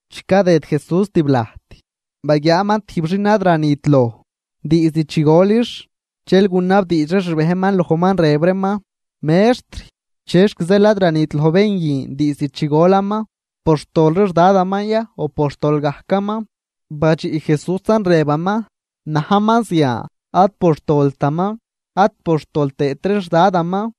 Chi cadëd Jesús tiblajt, baguiaaman tijb xin ad ranit loj diizd chi golix. Dxel gunabdiidx ree xbejnman lojman, rëb reeman: ―Mextr, ¿chexc zeel ad ranit loj bén guin diizd chi golaman? ¿Por xtol ree xDadaman ya, o por xtol gajcaman? Badxiꞌ Jesúsan, rëbaman: ―Najman zian ad por xtoltaman ad por xtol tëët ree xDadaman.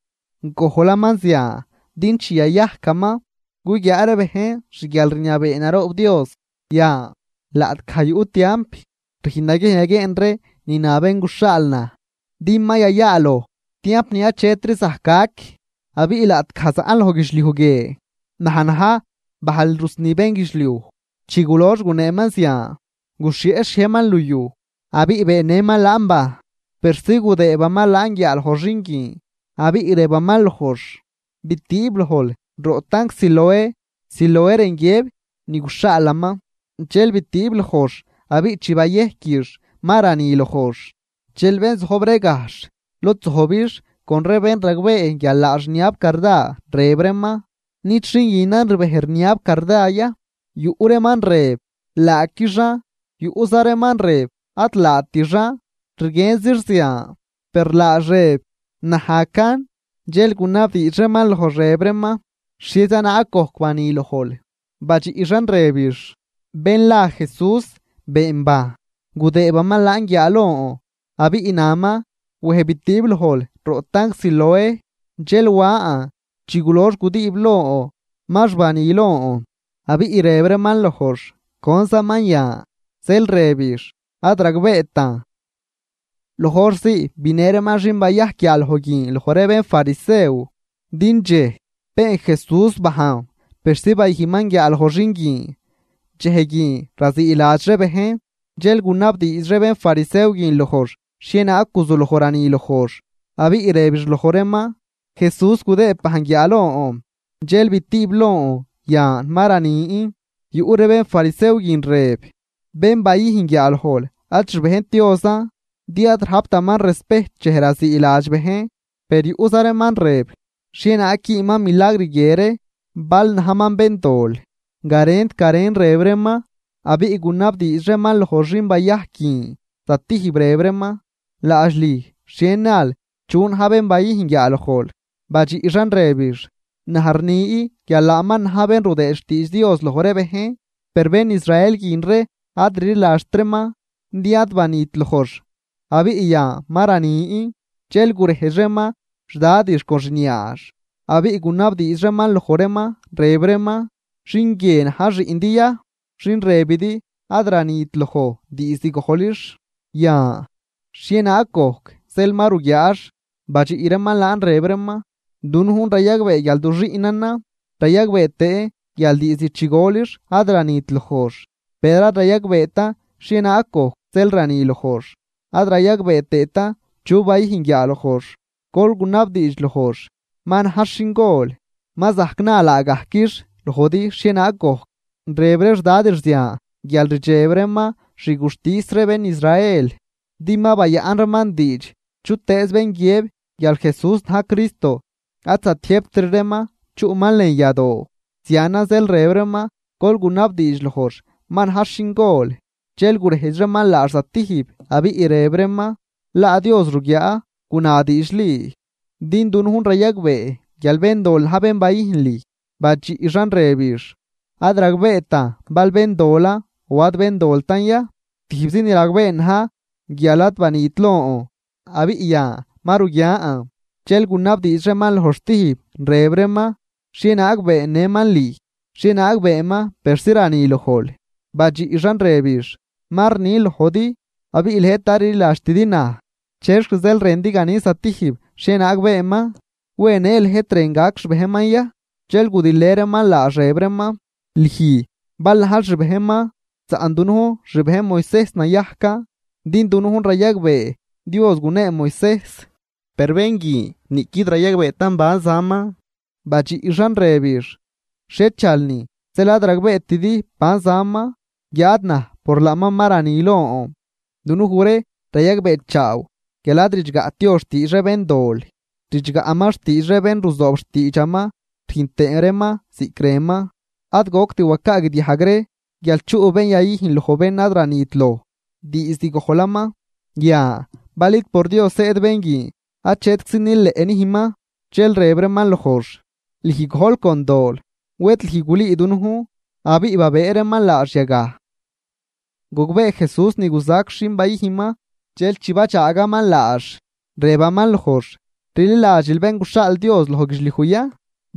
Gojlaman zian din chi yayajcaman, guguiaa ree bejn xguialrniabee naroob Dios. Yan, laꞌtgaj yuꞌ tiamp, rüjn naguiejn yaguieen ree ni na bén guxhaal naj, din ma yayaaloj tiamp ni achetri zajc gac. Abiꞌ laꞌtgaj zaꞌn loj guidxliuj guie, naj na̱j bajl rusni bénguidxliuj. Chi gulox guneeman zian, guxhieꞌ xhiejnman luyuj, abiꞌ beennëman laan bajn, persi gudëëbaman laan guiaaloj xin guin. Abiꞌ rëbaman lojx: ―Bitiib lojl roꞌ tanc Siloé ―Siloé rën guiëb ni guxhaalaman. Dxel bitiib lojx, abiꞌ chi bayejquix, ma rani lojx. Dxel bén zojb ree gajxh lod zojbix con ree bén ragbee guial laax rniab carda, rëb reeman: ―¿Nid xin guinan rbej rniab carda ya? Yuꞌ reeman rëb: ―Laaquixan. Yuꞌza reeman rëb: ―Ad laatixan, rguienzix zian. Per laax rëb: ―Najcan. Dxel gunabdiidx reeman lojx, rëb reeman: ―¿Xhieza naag gojc bani lojl? Badxiꞌxan, rëbix: ―Bén la Jesús been bajn, gudëëbaman guiaalon abiꞌ naman: “Wej bitiib lojl roꞌ tanc Siloé.” Dxel wan, chi gulox gudiib lon, max bani lon. Abiꞌ rëb reeman lojx: ―¿Conzaman yan? Zeel rëbix: ―Ad ragbeetan. Loj hor zii binë reeman xin bayajc guiaaloj guin loj ree bénfarisew, din dxej been Jesús bajn persi bayüjnman guiaaloj xin guin, dxej guin raziiladx ree bejn. Dxel gunabdiidx ree bénfarisew guin lojx xhienaag guzuloj rani lojx. Abiꞌ rëbix loj reeman: ―Jesús gudëëb bajn guiaalon, dxel bitiib lon, yan ma ranin. Yuꞌ ree bénfarisew guin rëb: ―Bén bayüjn guiaalojl ad xbejnt Diosan, din ad rajptaman respejt dxej raziiladx bejn. Per yuꞌza reeman rëb: ―¿Xhienaag güünman milagr guie ree, bal najman béndol? Garent garen rëb reeman. Abiꞌ gunabdiidx reeman loj xin bayajc guin zatijb, rëb reeman: ―¿Laadx lüj xhie nal chu na̱j bén bayüjn guiaalojl? Badxiꞌxan rëbix: ―Naj rni guial laaman na̱j bén rudëë xtiidx Dios loj ree bejn. Per bén Israel guin ree ad rliladxt reeman, din ad banit lojx abiꞌ yan ma ranin, dxel gurejdx reeman xdadix con xniaax, abiꞌ gunabdiidx reeman loj reeman, rëb reeman: ―¿Xin guien na̱j xiꞌndi ya, xin rëbidi ad ranit loj diizd gojlix? Yan, ¿xhienaag gojc zeel ma ruguiaax? Badxiꞌ reeman laan rëb reeman: ―Dunujn rayagbee guial du xiꞌnanan, rayagbee tëën guial diizd chi golix ad ranit lojx. Per ad rayagbeetan xhienaag gojc zeel rani lojx, ad rayagbee tëëtan chu bayüjn guiaalojx. Gol gunabdiidx lojx, ma najx xingol, ma zajc na laagajquix lojdi xhienaag gojc. Rëb ree xdadix zian guial rdxeb reeman xguxtis ree bén Israel, din ma bayaꞌn reeman diidx, chutëëz bén guiëb guial Jesús na̱j Cristo, ad zatiëjbtri reeman chuꞌman lën yadoo. Zianan zeel rëb reeman: “Gol gunabdiidx lojx, ma najx xingol.” Dxel gurejdx reeman laax zatijb, abiꞌ rëb reeman: ―Laa Dios ruguiaa, guna diidxli, din dunujn rayagbee guial béndol na̱j bén bayüjn lüj. Badxiꞌxan rëbix: ―Ad ragbeetan bal béndolan o ad béndoltan ya. Tijbzi ni ragbeen na̱j guial ad banit lon, abiꞌ yan ma ruguian. Dxel gunabdiidx reeman lojx stijb, rëb reeman: ―¿Xhienaag beennëman lüj? ¿Xhienaag beenman persi rani lojl? Badxiꞌxan rëbix: ―Ma rnin lojdi, abiꞌ lëjt ad rliladxtidi naj. ¿Chexc zeel rëndi ganin zatijb xhienaag beenman? ¿Wen në lëjt rën gac xbejnman ya? Dxel gudilë reeman laax rëb reeman: ―Lüj bal najl xbejnman, saꞌn dunujn xbejn Moisejs nayajcan. Din dunujn rayagbee Dios gunee Moisejs, per bén guin niꞌquid rayagbeetan ban zaman. Badxiꞌxan rëbix: ―¡Xhiechalnin zeel ad ragbeetidi ban zaman! Guiáad naj por laaman ma rani lon. Dunuj ree rayagbeechaaw guial ad ridxgaꞌt Dios xtiidx ree béndol, ridxgaꞌman xtiidx ree bén ruzoob xtiidxaman rüjn tëë reeman ziꞌc rënman. Ad goct wacaagdiajg ree guial chuꞌ bén yayüjn loj bén ad ranit loj diizd gojlaman. Yan, bal id por Dios zëëd bén guin, achetczi nileꞌ nüjnman. Dxel rëb reeman lojx: ―Lüj gojl con dol, ¿wed lüj gulüü dunujn? Abiꞌ babëë reeman laax yagaj. Gogbee Jesús ni guzac xin bayüjnman, dxel chi badxaagaman laax, rëbaman lojx: ―¿Rliladxil bén guxhaal Dios loj guidxliuj ya?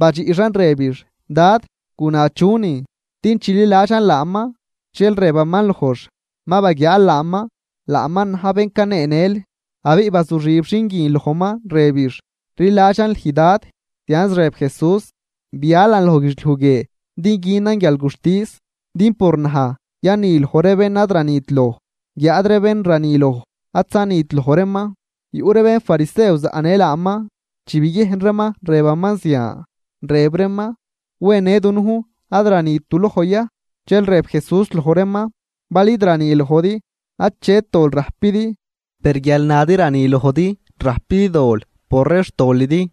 Badxiꞌxan rëbix: ―Dad, guna chunin, din chililadxan laaman. Dxel rëbaman lojx: ―Ma baguiaal laaman, laaman na̱j bén caneenël. Abiꞌ bazuxib xin guin lojman, rëbix: ―Rliladxan lüj, Dad. Zianz rëb Jesús: ―Bialan loj guidxliuj guie din günan guialguxtis, din por naj yani loj ree bén ad ranit loj, guiáad ree bén rani loj, ad zanit loj reeman. Yuꞌ ree bénfarisew zaꞌnë laaman. Chi biguiejn reeman rëbaman zian, rëb reeman: ―¿Wen në dunujn ad ranit duloj ya? Dxel rëb Jesús loj reeman: ―Bal id rani lojdi, achet dol rajpidi. Per guial nadi rani lojdi, rajpidi dol por ree xtolidi.